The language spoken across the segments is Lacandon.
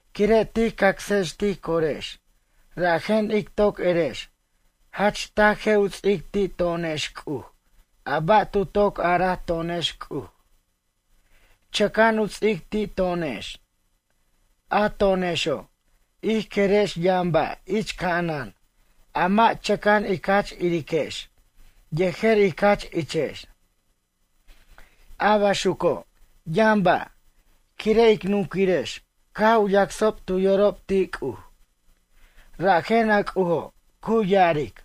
Quire' tij cacsex tij corex rajen ic toc erex jach taj je' u ts'ic ti' to'onex C'uj a ba' tu toc araj to'onex C'uj, chʌca'an u ts'ic ti' to'onex. A to'onexo', ij querex yʌn ba' ich ca'anan a mʌ' chʌca'an ic jach iriquex yejer ic jach ichex. A baxuco' yʌn ba', quire' ic nunquirex caj u yacsob tu yorob ti' C'uj, rajen a C'ujo' cu ya'aric: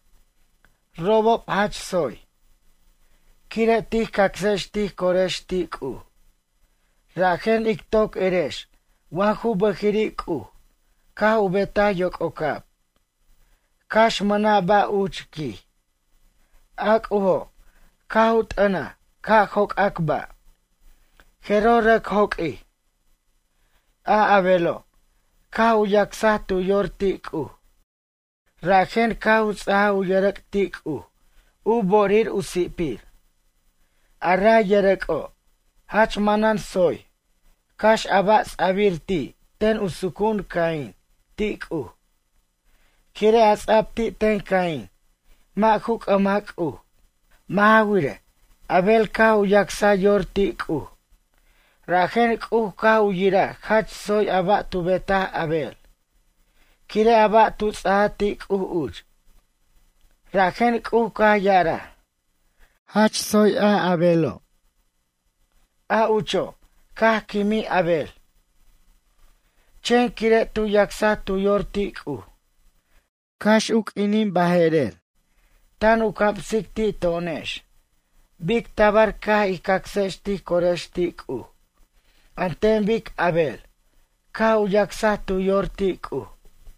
“Robob jach tsoy.” Quire' tij cacsex tij corex ti' C'uj, rajen ij toc erex wa ju bʌjiri' C'uj caj u betaj yoc'ocab, cax mʌna' ba' uch, quij, a C'ujo' caj u t'ʌnaj ca' joc'ac ba', jeroj rʌc joq'uij. A Abelo', caj u yacsaj tu yor ti' C'uj, rajen caj u ts'ajaj u yʌrʌc' ti' C'uj u bo'orir u si'pir. A ray yʌcʌc'o', jach manan tsoy cax a ba' ts'a'bir ti' ten u sucu'un Caín ti' C'uj. Quire' a ts'a'b ti' ten Caín, mʌ' ju c'ʌmaj C'uj. Mʌ' ja wirej, Abel caj u yacsa yor ti' C'uj. Rajen C'uj caj u yiraj jach tsoy a ba' tu betaj Abel, quire' a ba' tu ts'aja ti' C'uj uch. Rajen C'uj caj ya'araj: “Jach tsoy Abelo'.” A ucho' caj quimij Abel, chen quire' tu yacsaj tu yor ti' C'uj, cax q'uinij baje'rer tan u camsic ti' to'onex bic tabar ca' ij cacsex tij corex ti' C'uj an ten bic Abel caj u yacsaj tu yor ti' C'uj.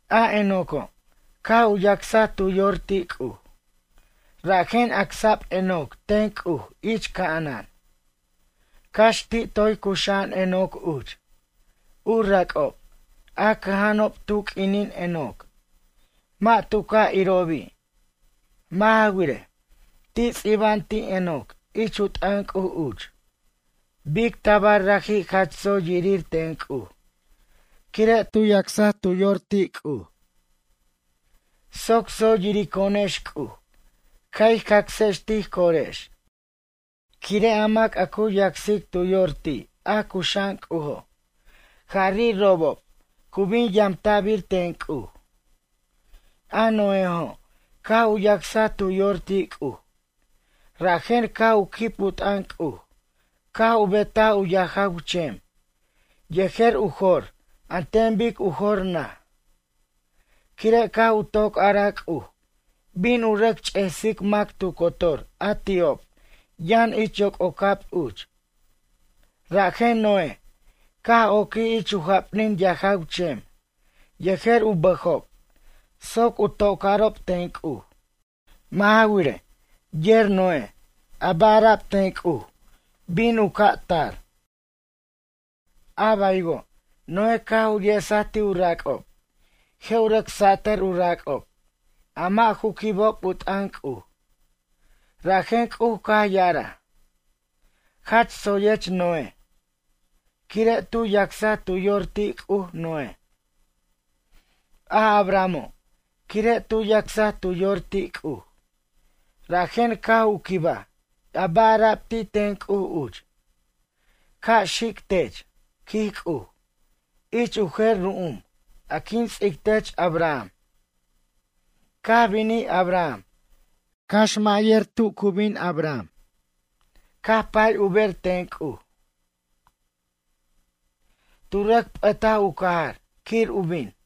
A Enoco', caj u yacsaj tu yor ti' C'uj, rajen acsa'b Enoc ten C'uj ich ca'anan, cax ti' toy cuxa'an Enoc uch. U rac'ob a cʌja'anob tu q'uinin Enoc, mʌ' tu ca' irobi'. Mʌ' ja wirej, ti' ts'iba'an ti' Enoc ich u t'ʌn C'uj uch, bic tabar raji' jach tsoy yirir ten C'uj quire' tu yacsaj tu yor ti' C'uj. Soc tsoy yirico'onex C'uj ca' ij cacsex tij corex. Quire' a mac a cu yacsic tu yor ti' a cuxa'an C'ujo', jari' robob cu bin yamta'bir ten C'uj. A Noéjo' caj u yacsaj tu yor ti' C'uj, rajen caj u quib u t'ʌn C'uj caj u betaj u yajaw chem yejer u jor an ten bic u jor naj. Quire' caj u toc araj C'uj bin u rʌc ch'esic mac tu cotor a ti'ob yʌn ich yoc'ocab uch, rajen Noé caj oquij ich u japnin yajaw chem yejer u bʌjob soc u tocarob ten C'uj. Mʌ' ja wirej, yer Noé a ba' ara'b ten C'uj bin u ca' tar. A baywo' Noé caj u yesaj ti' u rac'ob je' u rʌc satʌr u rac'ob a mʌ' ju quibob u t'ʌn C'uj. Rajen C'uj caj ya'araj: “Jach tsoyech Noé.” Quire' tu yacsa tu yor ti' C'uj, Noé. A Abrahamo', quire' tu yacsaj tu yor ti' C'uj rajen caj u quibaj a ba' ara'b ti' ten C'uj uch: “Ca' xic tech, quij C'uj, ich u jer ru'um a quin ts'ic tech Abraham.” Caj binij Abraham cax mʌ' yer tu ju bin Abraham caj pay u ber ten C'uj. Tu rʌc p'ʌtaj u cajar quir u bin.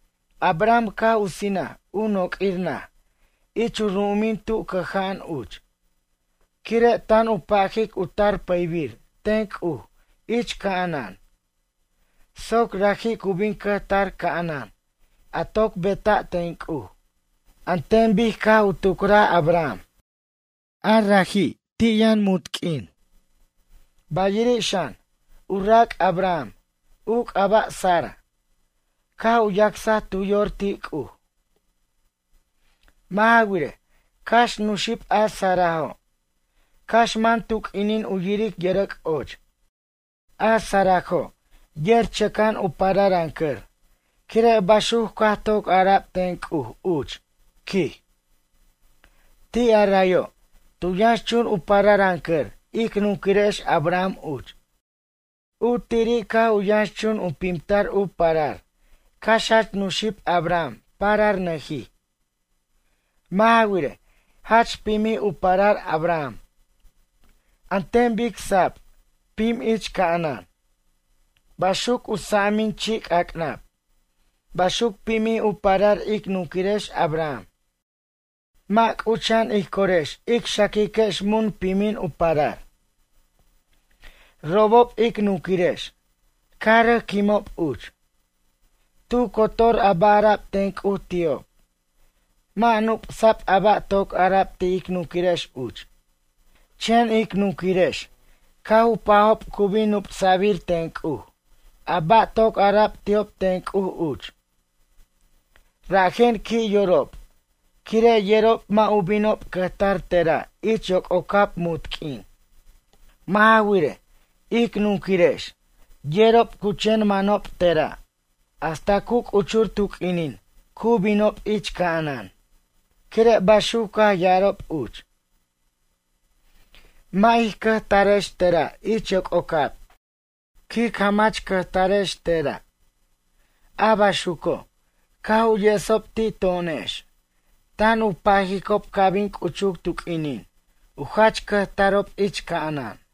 Abraham caj u sinaj u noq'uir naj ich u ru'umin tu cʌja'an uch, quire' tan u pajic u tar pʌybir ten C'uj ich ca'anan soc raji' cu bin cʌjtar ca'anan a toc beta' ten C'uj, an ten bic caj u tucraj Abraham. A raji'i', ti' yʌn munt q'uin. Bayiri' xan, u rac' Abraham, u c'aba' Sara, caj u yacsaj tu yor ti' C'uj. Mʌ' ja wirej, cax nuxib a Sarajo', cax man tu q'uinin u yiric yʌrʌc' och. A Sarajo' yer chʌca'an u pararancʌr quire' baxuc caj toc ara'b ten C'uj uch, quij. Ti' a rayo', tu yʌnxchun u pararʌncʌr ic nunquirex Abraham uch. U tiri' caj u yʌnxchun u pimtar u parar cax jach nuxib Abraham pararnʌjij. Mʌ' ja wirej, jach pimjij u parar Abraham an ten bic sab pim ich ca'anan, baxuc u sa'amin chi' c'ac'nab, baxuc pimij u parar ic nunquirex Abraham. Mʌ' c'ucha'an ij corex ic xaquiquex mun pimin u parar. Robob, ic nunquirex caj rʌc quimob uch. Tu cotor a ba' ara'b ten C'uj ti'ob mʌ' nup'sa'b a ba' toc ara'b ti' ic nunquirex uch. Chen ic nunquirex caj u pajob cu bin nup'sa'bir ten C'uj a ba' toc ara'ab ti'ob ten C'uj uch. Rajen qui' yorob quire' yerob mʌ' u binob cʌjtar tera' ich yoc'ocab munt q'uin. Mʌ' ja wirej, ic nunquirex yerob cu chen manob tera' hasta cu c'uchur tu q'uinin cu binob ich ca'anan. Quire' baxuc caj ya'arob uch: “Mʌ' ic cʌjtarex tera' ich yoc'ocab. Quic jamach cʌjtarex tera'.” A baxuco', caj u yesob ti' to'onex tan u pajicob ca' bin c'uchuc tu q'uinin u jach cʌjtarob ich ca'anan.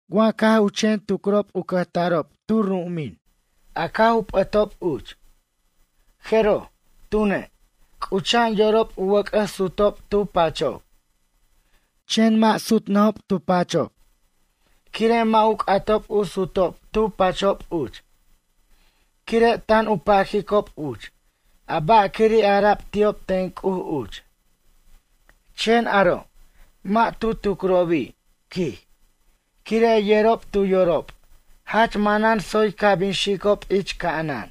Wa caj u chen tucricob u cʌjtarob tu ru'umin a caj u p'ʌtob uch, jeroj, tune', c'ucha'an yorob u wʌc'ʌs sutob tu pachob. Chen mʌ' sutnʌjob tu pachob quire' mʌ' u c'atob u sutob tu pachob uch, quire' tan u pajicob uch a ba'quiri' ara'b ti'ob ten C'uj uch. Chen aro' mʌ' tu tucrobi', quij, quire' yerob tu yorob jach manan tsoy ca' bin xicob ich ca'anan.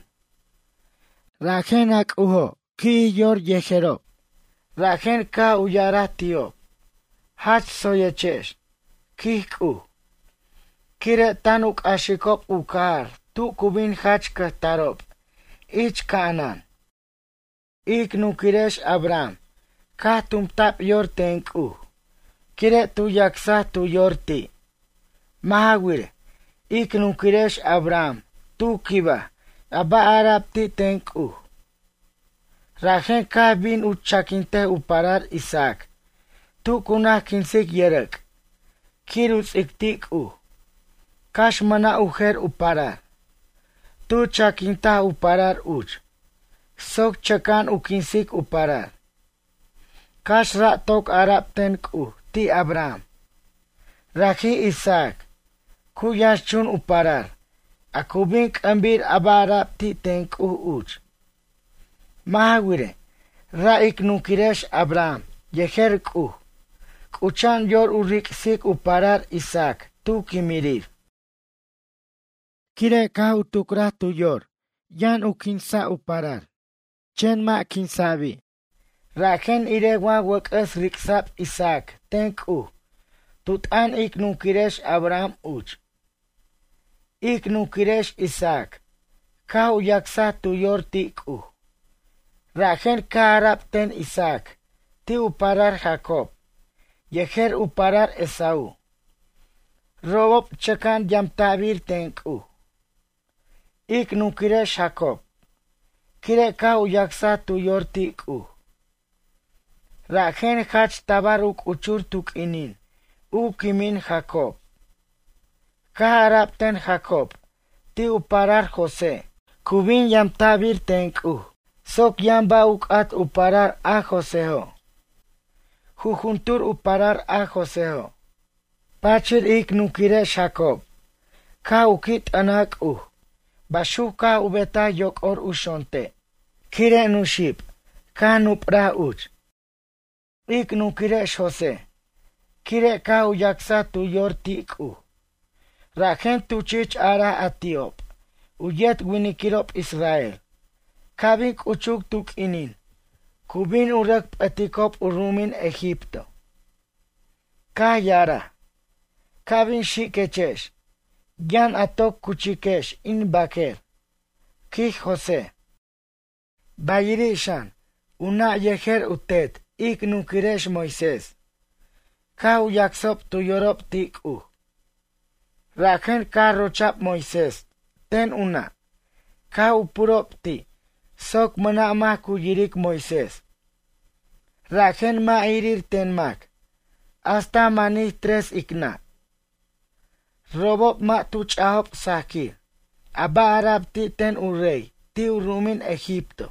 Rajen a C'ujo' qui'jij yor yejerob, rajen caj u ya'araj ti'ob: “Jach tsoyechex”, quij C'uj, quire' tan u c'axicob u cajar tu cu bin jach cʌjtarob ich c'a'anan. Ic nunquirex Abraham caj tumta'b yor ten C'uj quire' tu yacsaj tu yor ti'. Mʌ' ja wirej, ic nunquirex Abraham tu quibaj a ba' ara'b ti' ten C'uj. Rajen caj bin u chaquintej u parar Isaac tu cu naj quinsic yʌrʌc' quir u ts'ic ti' C'uj, cax mʌna' u jer u parar. Tu chaquintaj u parar uch soc chʌca'an u quinsic u parar, cax ra' toc ara'b ten C'uj ti' Abraham: “Raji' Isaac, cu yʌxnchun a parar a cu bin c'ʌmbir a ba' ara'b ti' ten C'uj uch.” Mʌ' ja wirej, ra' ic nunquirex Abraham yer C'uj c'ucha'an yor u ric'sic u parar Isaac tu quimirir. Quire' caj u tucraj tu yor yʌn quinsa' u parar, chen mʌ' quinsa'bir rajen irej wa wʌc'ʌs ric'sa'b Isaac ten C'uj tu t'ʌn ic nunquirex Abraham uch. Ic nunquirex Isaac, caj u yacsaj tu yor ti' C'uj, rajen caj ara'b ten Isaac ti' u parar Jacob yejer u parar Esaú, robob chʌca'an yamta'bir ten C'uj. Ic nunquirex Jacob, quire' caj u yacsaj tu yor ti' C'uj. Rajen jach tabar u c'uchur tu q'uinin u quimin Jacob, caj ara'b ten Jacob ti' u parar José cu bin yamta'bir ten C'uj soc yʌn ba' u c'at u parar a Joséjo', jujuntur u parar a Joséjo'. Pachir ic nunquirex Jacob caj u qui' t'ʌntaj C'uj, baxuc caj u betaj yoc'or u xonte' quire' nuxib caj nupraj uch. Ic nunquirex José, quire' caj u yacsaj tu yor ti' C'uj, rajen tu chich araj a ti'ob u yet winiquirob israel, ca' bin c'uchuc tu q'uinin cu bin u rʌc p'ʌticob u ru'umin Egipto. Caj ya'araj: “Ca' bin xiquechex yʌn a toc cuchiquex in baquer”, quij José. Bayiri' xan, u nʌ' yejer u tet ic nunquirex Moisés, caj u yacsob tu yorob ti' C'uj. Rajen caj rocha'b Moisés ten u nʌ' caj u purob ti' soc mʌna' mac cu yiric Moisés, rajen mʌ' irir ten mac hasta manij tres ic nʌ'. Robob mʌ' tu ch'ajob sajquir a ba' ara'b ti' ten u rey ti' u ru'umin Egipto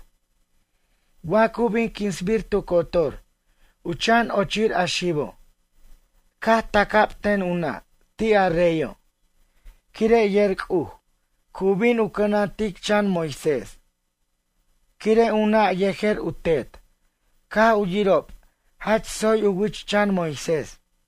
wa cu bin quinsbir tu cotor u chan ochir a xibo'. Caj taca'b ten u nʌ' ti' a reyo' quire' yer C'uj cu bin u cʌnantic chan Moisés quire' u nʌ' yejer u tet caj u yirob jach tsoy u wich chan Moisés.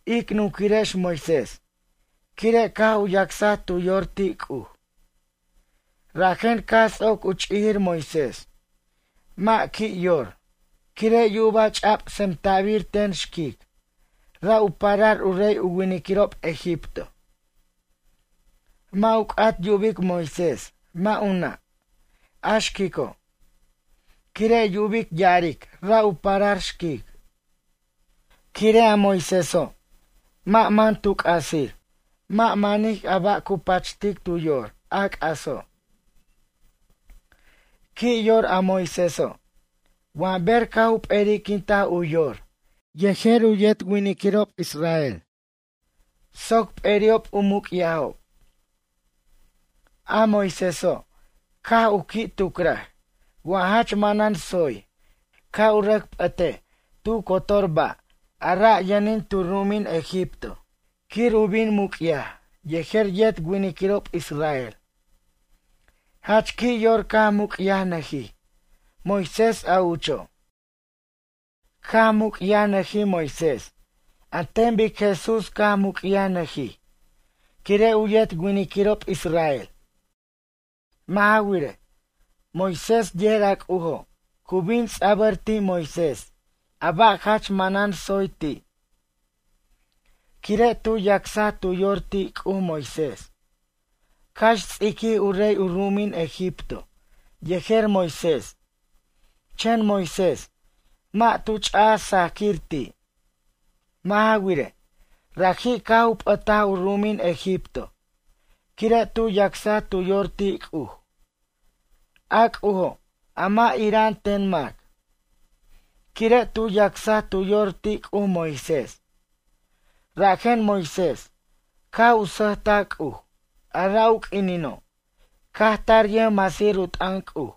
Ic nunquirex Moisés, quire' caj u yacsaj tu yor ti' C'uj, rajen caj ts'oc u ch'ijir Moisés mʌ' qui' yor quire' yuba' ch'a'b tsemta'bir ten xquic, ra' u parar u rey u winiquirob egipto. Mʌ' u c'at yubic Moisés, mʌ' u nʌ', a xquico'. Quire' yubic ya'aric ra' u parar xquic. Quire' a Moiséso', mʌ' man tu c'asir, mʌ' manij a ba' cu pachtic tu yor, a c'aso'. Qui' yor a Moiséso' wa ber caj u p'eri'quintaj u yor yejer yet winiquirob israel soc p'eri'ob u muc'yajob. A Moiséso', caj u qui' tucraj wa jach manan tsoy ca' u rʌc p'ʌtej tu cotor ba' a ra' yʌnin tu ru'umin Egipto quir u bin muc'yaj yejer yet winiquirob israel. Jach qui' yor caj muc'yajnʌjij Moisés a ucho'. Caj muc'yajnʌjij Moisés an ten bic Jesús caj u muc'yajnʌjij quire' u yet winiquirob israel. Mʌ' ja wirej, Moisés yer a C'ujo' cu bin ts'abʌr ti' Moisés a ba' jach manan tsoy ti'. Quire' tu yacsaj tu yor ti' C'uj Moisés, cax ts'iquij u rey u ru'umin Egipto yejer Moisés, chen Moisés mʌ' tu ch'aj sajaquir ti'. Mʌ' ja wirej, raji' caj u p'ʌtaj u ru'umin Egipto quire' tu yacsaj tu yor ti' C'uj, a C'ujo' a mʌ' ira'an ten mac. Quire' tu yacsaj tu yor ti' C'uj Moisés, rajen Moisés caj u sʌjtaj C'uj a ra' u q'uinino' caj tar yʌjmasir u t'ʌn C'uj,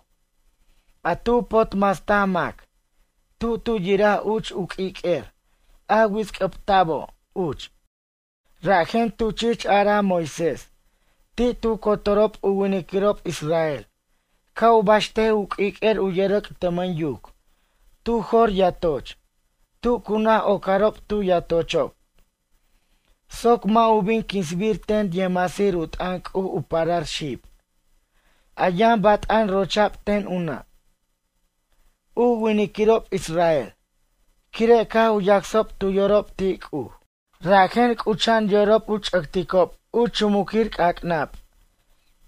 a tu potmastaj mac tu tu yiraj uch u q'uiq'uer a wits'c'ʌbta'bo' uch. Rajen tu chich araj Moisés ti' tu cotorob u winiquirob israel ca' u baxtej u q'uiq'uer u yʌrʌc' tʌmʌn yuc tu jo'r yatoch tu cu naj ocarob tu yatochob soc mʌ' u bin quinsbir ten yʌjmasir u t'ʌn C'uj u parar xib, a yʌn bat'an rocha'b ten u nʌ'. U winiquirob israel, quire' caj u yacsob tu yorob ti' C'uj, rajen c'ucha'an yorob u ch'ʌcticob u chumuquir c'ac'nab,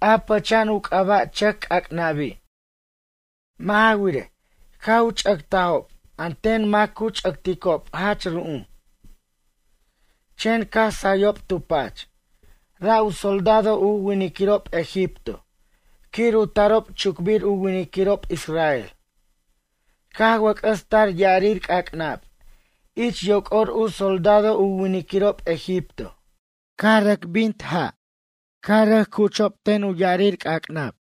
a pʌcha'an u c'aba' chʌc c'ac'nabi'. Mʌ' ja wirej, caj u ch'ʌctajob an ten mac cu ch'ʌcticob jach ru'um. Chen caj sayob tu pach, ra' u soldado u winiquirob egipto quir u tarob chucbir u winiquirob israel, caj wʌc'ʌs tar ya'arir c'ac'nab ich yoc'or u soldado u winiquirob egipto, caj rʌc bintob ja', caj rʌc chuchob ten u ya'arir c'ac'nab.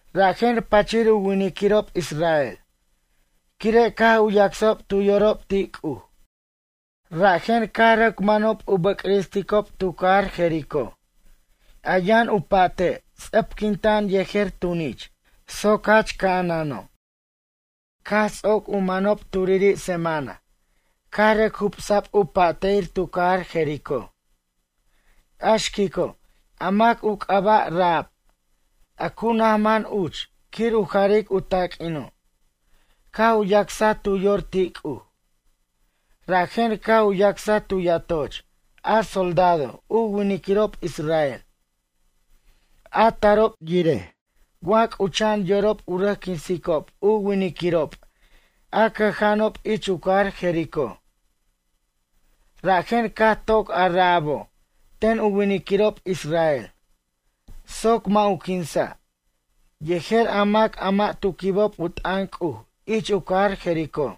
Rajen pachir u winiquirob israel, quire' caj u yacsob tu yorob ti' C'uj, rajen caj rʌc manob u bʌcristicob tu cajar Jericó, a yʌn u pa'te' ts'ʌpquinta'an yejer tunich soc jach ca'anano'. Caj ts'oc u manob turiri' semana caj rʌc jubsa'b u pa'te'ir tu cajar Jericó. A xquico', a mac u c'aba' Rahab, a cu naj man uch quir u jaric u taq'uino', caj u yacsaj tu yor ti' C'uj. Rajen caj u yacsaj tu yatoch a soldado u winiquirob israel, a tarob yiraj wa c'ucha'an yorob u rʌc quinsicob u winiquirob a cʌja'anob ich u cajar Jericó. Rajen caj toc a Rahabo' ten u winiquirob israel soc mʌ' u quinsa' yejer a mac a mʌ' tu quibob u t'ʌn C'uj ich u cajar Jericó.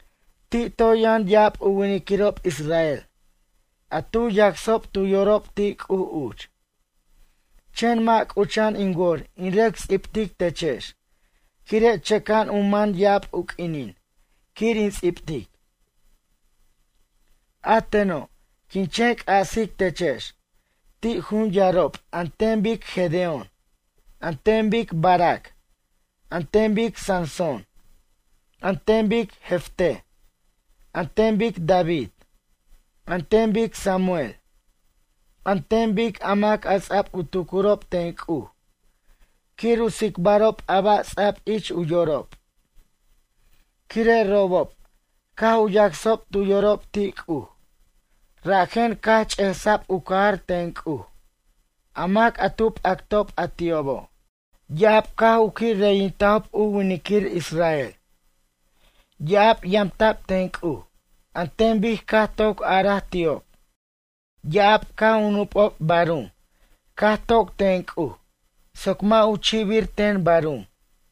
Ti' toy yʌn ya'ab u winiquirob israel a tu yacsob tu yorob ti' C'uj uch, chen mʌ' c'ucha'an in wor in rʌc ts'ibtic techex quire' chʌca'an u man ya'ab u q'uinin quir in ts'ibtic. A teno', quin chen c'asic techex ti' jun yarob an ten bic Gedeón, an ten bic Barac, an ten bic Sansón, an ten bic Jefté, an ten bic David, an ten bic Samuel, an ten bic a mac ts'ab u tucurob ten C'uj quir u tsicbarob a ba' ts'a'b ich u yorob, quire' robob caj u yacsob tu yorob ti' C'uj, rajen caj ch'esa'b u cajar ten C'uj a mac a tu p'actob a ti'obo'. Ya'ab caj u qui' reyintajob u winiquir israel, ya'ab yamta'b ten C'uj an ten bic caj toc araj ti'ob. Ya'ab caj u nupob barum caj toc ten C'uj soc mʌ' u chi'bir ten barum.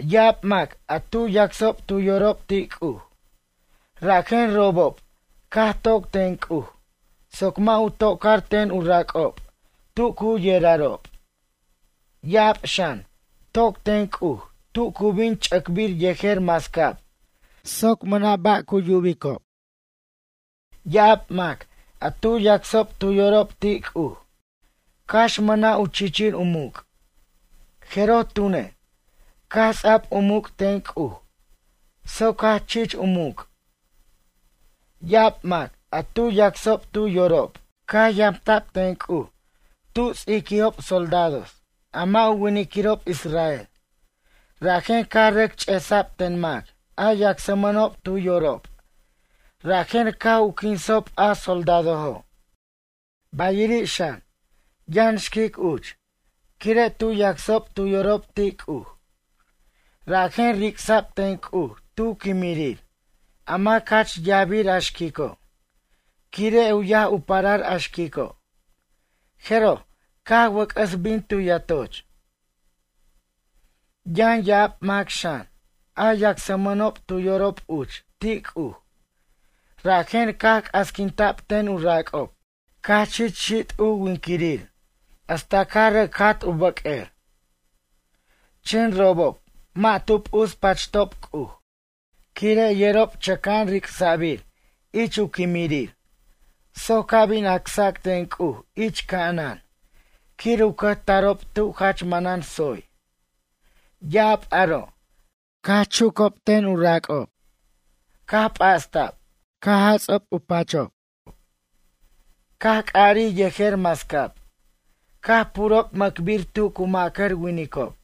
Ya'ab mac a tu yacsob tu yorob ti' C'uj, rajen robob caj toc ten C'uj soc mʌ' u tocar ten u rac'ob tu cu yerarob. Ya'ab xan, toc ten C'uj tu cu bin ch'ʌcbir yejer mascab soc mʌna' ba' cu yubob. Ya'ab mac a tu yacsob tu yorob ti' C'uj, cax mʌna' u chichir u muc', jeroj tune', caj ts'a'b u muc' ten C'uj soc jach chich u muc'. Ya'ab mac a tu yacsob tu yorob caj yamta'b ten C'uj tu ts'iquijob soldados, a mʌ' u winiquirob israel, rajen caj rʌc ch'esa'b ten mac a yacsmʌnob tu yorob rajen caj u quinsob a soldadojo'. Bayiri' xan, yʌn xquic uch, quire' tu yacsob tu yorob ti' C'uj, rajen ric'sa'b ten C'uj tu quimirir a mac jach yajbir a xquico', quire' u yaj u parar a xquico', jeroj, caj wʌc'ʌs bin tu yatoch. Yʌn ya'ab mac xan, a yacsmʌnob tu yorob uch ti' C'uj rajen caj c'asquinta'b ten u rac'ob, caj chich xit' u winquirir hasta caj rʌc jat u bʌq'uer. Chen robob mʌ' tu p'uspachtob C'uj quire' yerob chʌca'an ric'sa'bir ich u quimirir soc ca' bin acsac ten C'uj ich ca'anan quir u cʌjtarob tu jach manan tsoy. Ya'ab aro', caj chuca'b ten u rac'ob, caj p'asta'b, caj jats'a'b u pachob, caj c'arij yejer mascab caj purob mʌcbir tu cu macar winicob.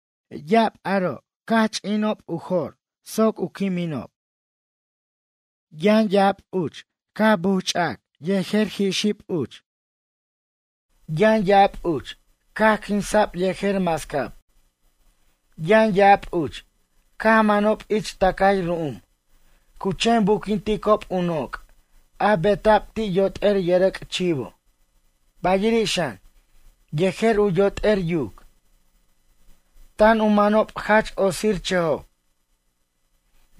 Ya'ab aro' caj ch'ina'b u jo'r soc u quininob. Yʌn ya'ab uch caj bujch'ʌcaj yejer jixib uch. Yʌn ya'ab uch, caj quinsa'b yejer mascab. Yʌn ya'ab uch, caj manob ich tʌcay ru'um cu chen buquinticob u noc' a beta'b ti' yot'er yʌrʌc' chivo, bayiri' xan yejer u yot'er yuc. Tan u manob jach otsirchʌjob,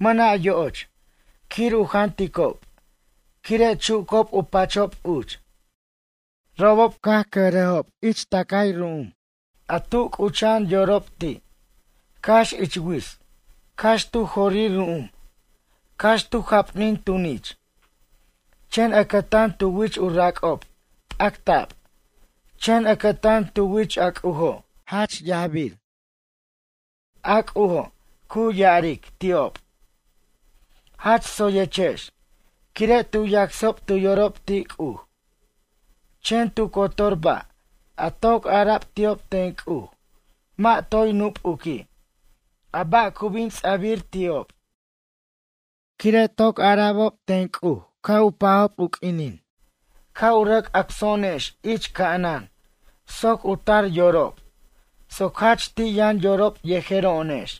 mʌna' yo'och quir u janticob quire chucob u pachob uch. Robob caj cʌjrajob ich tʌcay ru'um a tu c'ucha'an yorob ti', cax ich wits, cax tu jorir ru'um, cax tu japnin tunich. Chen ʌcʌtan tu wich u rac'ob p'acta'b, chen ʌcʌtan tu wich a C'ujo' jach yaj. A C'ujo' cu ya'aric ti'ob: “Jach tsoyechex”, quire' tu yacsob tu yorob ti' C'uj. Chen tu cotor ba' a toc ara'b ti'ob ten C'uj mʌ' toy nupuqui' a ba' cu bin ts'a'bir ti'ob. Quire' toc ara'bob ten C'uj u pajob u q'uinin ca' u rʌc acso'onex ich ca'anan soc u tar yorob soc jach ti' yʌn yorob yejero'onex.